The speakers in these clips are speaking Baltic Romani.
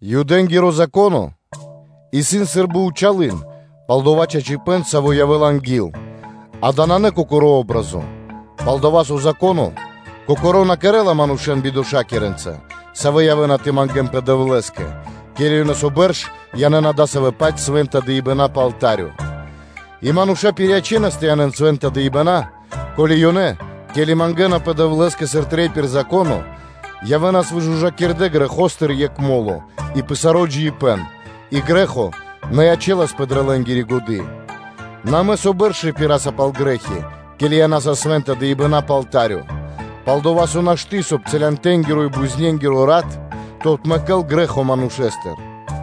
Юдэ́нгиро Зако́но исын сы́рбы зэр (тенё) пал дова́ чачипэ́н, саво́ явэ́ла анги́л, дава́ нанэ кокори патри́н (о́бразо). Палдова́ со Зако́но кокоро́ на кэрэ́ла манушэ́н бидошакирэнца, савэ́ явэ́на тэ мангэ́нпэ Дэвлэ́скэ, ке́ли ёнэ со бэрш янэ́на дасавэ́-паць свэ́нта дыибэна́ пэ алта́рё. И мануша́ пириячэнас тэ янэ́н свэ́нта дыибэна́ (жэртвы), ко́ли ёнэ, ке́ли мангэ́напэ Дэвлэ́скэ сыр трэй пир Зако́но, явэ́нас выжужакирдэ грэхостыр екх мо́ло и пэ саро́ джиибэ́н, и грэ́хо на ячэласпэ дрэ лэ́нгири годы́.” Нэ амэ со бэрш рипираса пал грэ́хи, ке́ли янаса свэ́нта дыибэна́ пэ алта́рё. Пал-дова́ со нашты́, соб (кай) целянтэнгиро и бузнэнгиро (козлэнгиро) рат тэ отмэкэ́л грэ́хо манушэ́стыр.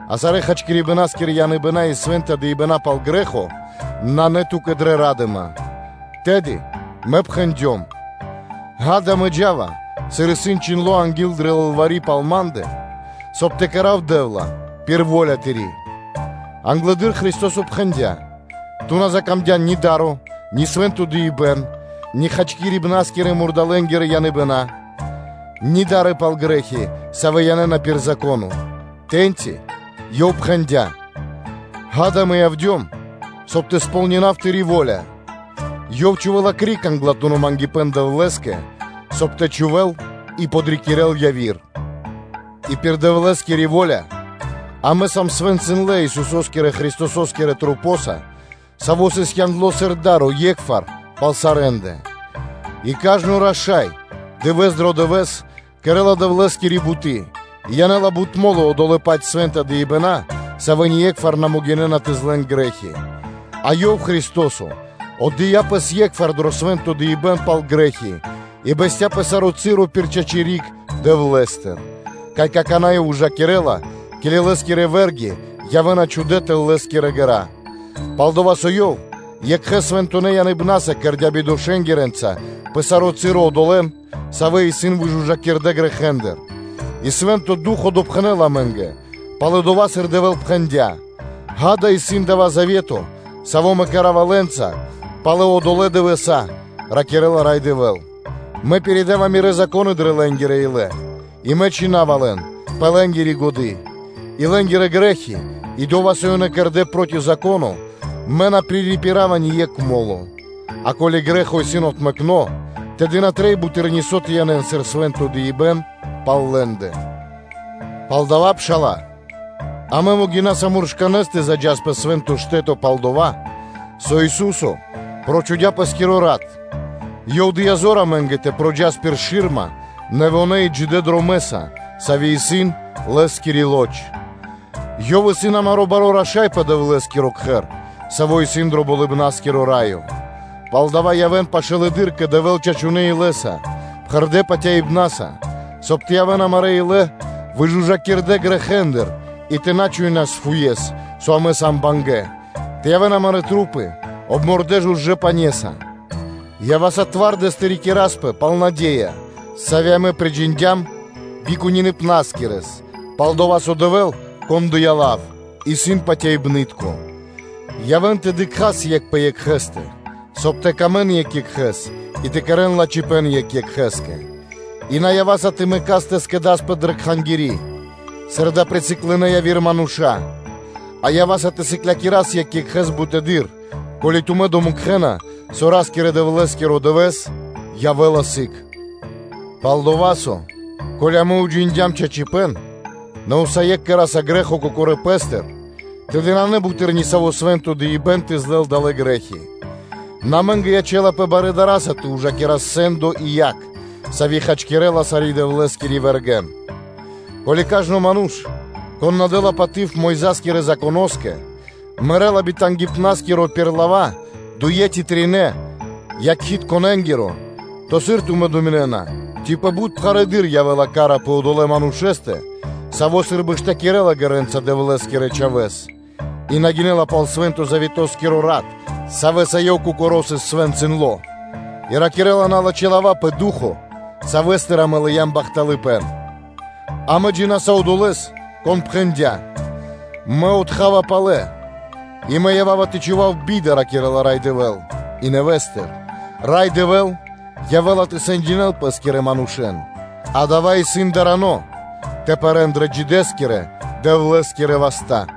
А цэлонэ́-хачкирибнаскирэ яныбэна́ и свэ́нта дыибэна́ пал грэ́хо нанэ ту́кэ дрэ ра́дыма. Тэды Мэ пхэндём: “Гада, Мэ джа́ва, сыр исын чхиндло́ анги́л дрэ лылвари́ пал ма́ндэ; соб (кай) тэ сполнинав, Дэ́вла, во́ля Тыри́.” Англэды́р Христо́со пхэндя́: “Ту на мангдян ни да́ро, ни свэ́нто дыибэ́н, ни цэлонэ́-хачкирибнаскирэ яныбэна́, ни да́ры пал грэ́хи, савэ́ янэ́на пир Зако́но.” Тэ́ньци Ёв пхэндя́: Ѓа́да, Мэ явдём, соб (кай) тэ сполнинав Тыри́ во́ля.” Ёв чхувэ́ла криг англатуно́ мангипэ́н (па́тери) Дэвлэ́скэ, соб (кай) тэ чхувэ́л и подрикирэ́л яви́р; и пир Дэвлэ́скири во́ля амэ сам свэнцындлэ Исусо́скирэ Христосо́скирэ мэнькэндыр дрэ маса́, савэ́ сыс яндлэ́ сыр да́ро е́кхвар, пал сарэ́ндэ. И кажно (сва́ко) раша́й дывэ́с дро дывэ́с кэрэ́ла Дэвлэ́скири буты́ и янэ́ла бут мо́лы одолэ́-паць свэ́нта дыибэна́, савэ́ ние́кхвар на могинэ́на тэ злэн грэ́хи, а Ёв, Христо́со, отдыя́ Пэс е́кхвар дро свэ́нто дыибэ́н пал грэ́хи и бэсця́ пэ саро́ часо пир чачи́ (право) риг Дэвлэ́стыр, кай какана́ Ёв ужакирэ́ла, ке́ли Лэ́скирэ вэ́рги явэ́на чхудэ́ тэл Лэ́скирэ ґэра́. Пал-дова́ со Ёв екхэ свэнтонэ́ яныбнаса кэрдя́ бидошакирэнца пэ саро́ часо одолэ́н, савэ́ исын выжужакирдэ грэхэ́ндыр. И Свэ́нто Ду́хо (Фа́но) допхэнэ́ла амэ́нгэ: пало́ (после) дова́, сыр Дэвэ́л пхэндя́: “Ѓа́да, исын дава́ завето, саво́ Мэ кэра́ва лэ́нца пало́ одолэ́ дывэса́, – ракирэ́ла Рай Дэвэ́л: – Мэ пиридава Мирэ́ Зако́ны дрэ лэ́нгирэ илэ́ и Мэ чхина́ва лэн пэ лэ́нгири годы́”; и лэ́нгирэ грэ́хи и дова́, со ёнэ кэрдэ́ проти Зако́но, Мэ на пририпирава ни екх мо́ло. А ке́ли грэ́хо исын отмэкно, тэды на трэй буты́р нисо́ тэ янэ́н сыр свэ́нто дыибэ́н пал лэ́ндэ. Палдава́, пшала́лэ, амэ могинаса муршканэ́с тэ заджас пэ Свэ́нто Штэ́то, пал-дова́ со Ису́со прочхудя Пэ́скиро рат; Ёв дыя́ зор амэ́нгэ тэ проджас пир шы́рма нэвонэ́ и джидэ́ дромэ́са, саво́ исын пир Лэ́скири лоч (плоть); Ёв исын амаро́ Баро́ Раша́й пэ Дэвлэ́скиро Кхэр, саво́ исын дро Болыбна́скиро Раё; палдава́ явэ́н пашылэды́р кэ Дэвэ́л чачунэ́ илэ́са, пхэрдэ́ патяибна́са, соб (кай) тэ явэ́н амарэ́ илэ выжужакирдэ грэхэ́ндыр и тэ на чуинас фуес, со амэ сам бангэ́; тэ явэ́н амарэ́ маса́ обмордэ жужэ́ пане́са. Ява́са тэ рикираспэ зоралэ́с пал наде́я, сави́ амэ приджиндям би кунипна́скиро, пал-дова́ со Дэвэ́л, Кон дыя́ лав, исын патяибны́тко; явэ́н тэ дыкхас екх пэ екхэ́стэ, соб (кай) тэ сыкавэ́н паты́в екх екхэ́скэ и тэ кэрэ́н лачхипэ́н екх екхэ́скэ; и на ява́са тэ мэкас тэ скэдаспэ дрэ кхангири́, сыр дава́ присыклынэ яви́р мануша́, а ява́са тэ сыклякирас екх екхэ́с бутэды́р, ко́ли тумэ́ дыкхэ́на, со Ра́скирэ-Дэвлэ́скиро Дывэ́с явэ́ла сыг. Пал-дова́ со, ко́ли амэ уджиндям чачипэ́н, нэ усае́кх кэра́са грэ́хо кокорэ́ пэ́стыр, тэды нанэ буты́р нисаво́ свэ́нто дыибэ́н тэ злэл далэ́ грэ́хи, нэ амэ́нгэ ячэ́лапэ барэ́ дара́са тэ ужакирас сэ́ндо и яг, сави́ хачкирэ́ла сарэ́ Дэвлэ́скирэ вэргэ́н. Ко́ли кажно ману́ш, кон на дэ́ла паты́в Мойза́скирэ Законо́скэ, мэрэ́ла битангипнаскиро пир лава́ дуе́ ци тринэ́ якхитконэнгиро (свидетеленгиро): то, сыр тумэ́ думинэ́на, ци пэ бут пхарэдыр явэ́ла ка́ра пэ одолэ́ манушэ́стэ, саво́ сы́рбы штакирэла ґэрэ́нца Дэвлэ́скирэ Чхавэ́с и на гинэ́ла пал свэ́нто завето́скиро рат, савэ́са ёнэ кокоро́ сыс свэнцындло, и ракирэ́ла налачхэ́ лава́ пэ Ду́хо (Фа́но), Савэ́стыр амэ лыям бахталыпэ́н? Амэ джина́са Одолэ́с, Кон пхэндя́: “Мэ отха́ва палэ́ (Мэ отомстинава), и Мэ ява́ва тэ чхував би́да” – ракирэ́ла Рай Дэвэ́л.” И нэвэ́стыр: “Рай Дэвэ́л явэ́ла тэ сэндякирэ́л Пэ́скирэ манушэ́н.” Дава́ исын дарано тэ пэрэ́н дрэ джидэ́ Дэвлэ́скирэ васта́.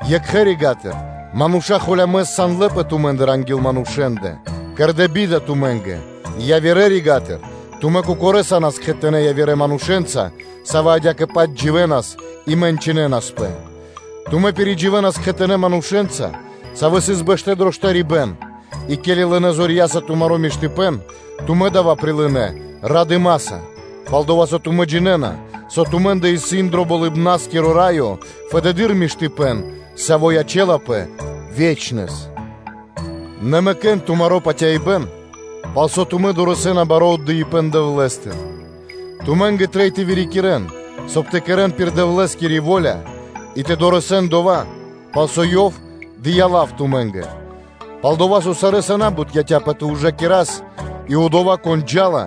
екхэ рига́тыр, мануша́ холямэс сандлэпэ тумэ́ндыр анги́л манушэ́ндэ, кэрдэ́ би́да тумэ́нгэ; явирэ рига́тыр, тумэ́ кокорэ́ са́нас кхэтанэ́ явирэ манушэ́нца, савэ́ адя́кэ-паць дживэ́нас и мэнчынэнаспэ. Тумэ́ пиридживэнас кхэтанэ́ манушэ́нца, савэ́ сыс бэштэ́ дро штарибэ́н, и ке́ли лынэ́ зорья́са тумаро́ миштыпэ́н, тумэ́ дава́ прилынэ́ радыма́са, пал-дова́ со тумэ́ джинэ́на, со тумэ́ндэ исын дро Болыбна́скиро Раё фэдэды́р миштыпэ́н, саво́ ячэ́лапэ ве́чнэс. На мэкэ́н тумаро́ патяибэ́н, пал со тумэ́ дорэсэ́на баро́ отдыибэ́н Дэвлэ́стыр. Тумэ́нгэ трэй тэ вырикирэн, соб (кай) тэ кэрэ́н саро́ пир Дэвлэ́скири во́ля и тэ дорэсэн дова́, пал со Ёв дыя́ лав тумэ́нгэ. Пал-дова́ со сарэ́са на́бут яця́пэ тэ ужакирас, и Одова́, Кон джа́ла,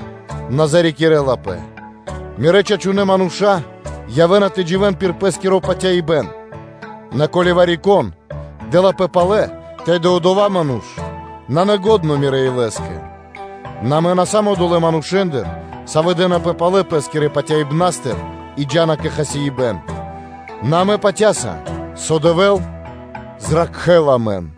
на зарикирэлапэ. Мирэ́ чачунэ́ мануша́ явэ́на тэ дживэ́н пир пэ́скиро патяибэ́н, нэ ко́ли вари-кон дэ́лапэ палэ́, тэды одова́ ману́ш нанэ лачхо́ Мирэ́ илэскэ. Нэ амэ на сам одолэ́ манушэ́ндыр, савэ́ дэнапэ палэ пэ́скирэ патяибнастыр и джа́на кэ хасибэ́н; нэ амэ патя́са, со Дэвэ́л зракхэ́ла амэн.